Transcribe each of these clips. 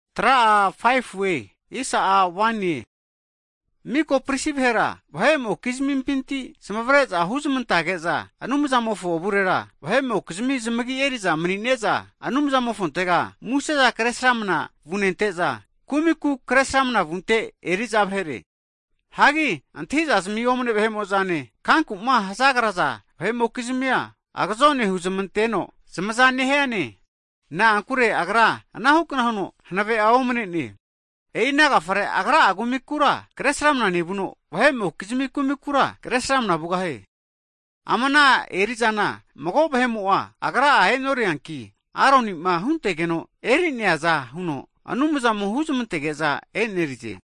Hagi miko pristi vahera vahepinti zamavare'za huzamantage'za Anumzamofo avurera vahe'mokizmi zamagi eri'za mani'ne'za Anumzamofontega museza kre sramana vunente'za, kumiku kresramana vunte eri'za vahere. Hagi antahizazmi omne vahe'mo'zane kankuma hazagraza vahe'mokizimia agazone huzamanteno zamaza nehiane, na'ankure agra anahukna huno hanavea omnene. E'i ana agafare agra'a kumikura kresramana nevuno, vahe'mokizmi kumikura kresramana vugahie. Ama ana eri'zana mago vahe'mo'a agra'a e'norianki, Aronima huntegeno eri'neaza huno, Anumzamo huzamantege'za e'nerize.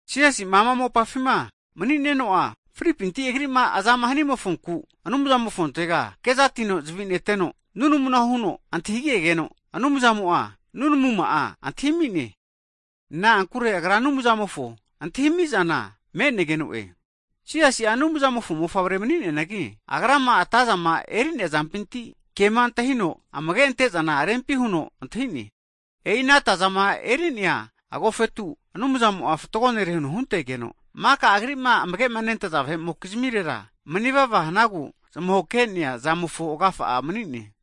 Jisasi'ma ama mopafima mani'neno'a, fripinti Agri'ma azama hanimonfonku, Anumzamofontega kezatino zavineteno, nunamu huno antahinegegeno, Anumzamo'a nunamuma'a antahi ami'ne, na'ankure Agra Anumzamofo antahimizana me'negeno'e. Jisasi'a, Anumzamofo mofavre mani'neanagi, Agrama atazama eri'nea zampinti, kema antahino amage antezana rempi huno antahine. E'i ana atazama eri'nea agofetu Anumzamo'a fatgo nere huntegeno, maka Agri'ma amage'ma antaza vahe'mokizmirera, manivava hanagu zmahokenea zamofo agafa'a mani'ne.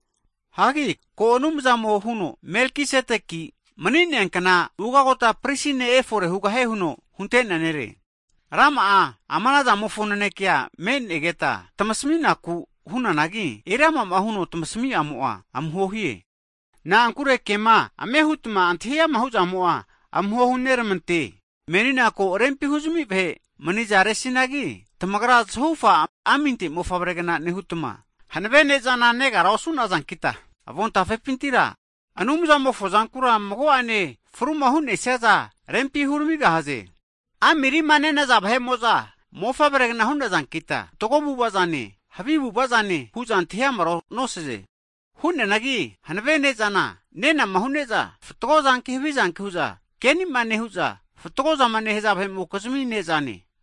Hagi ko Anumzamo'a huno, Melkisedeki mani'neankna Ugota Pristi ne' efore hugahie huno hunte'nea nere. Rama'a ama nazamofo nanakea me'negeta tamasmi'naku hunanagi, eriama'ma huno tamasmi'amo'a amuhohie, na'ankure kema ame hutma antahi ama hu'zamo'a amuho huneramante Menina ko rempi hu'zami vahe manizaresinagi, tamagra zahufa aminte mofavregna nehutma hanave ne'zana negara osu'nazankita, avontafepintira Anumzamofo zankura mago'ane fruma hu'nesiaza rempi huramigahaze. Ami rima nenaza vahe'mo'za mofavregna hu'nazankita, fatgo avu'avazane havi avu'avazane hu'za antahi amara nosaze. Hu'neanagi hanave ne'zana, nenama hu'ne'za, fatgozanki havizanki hu'za kenima nehu'za, fatgozama nehaza vahe'mokizmi nezane.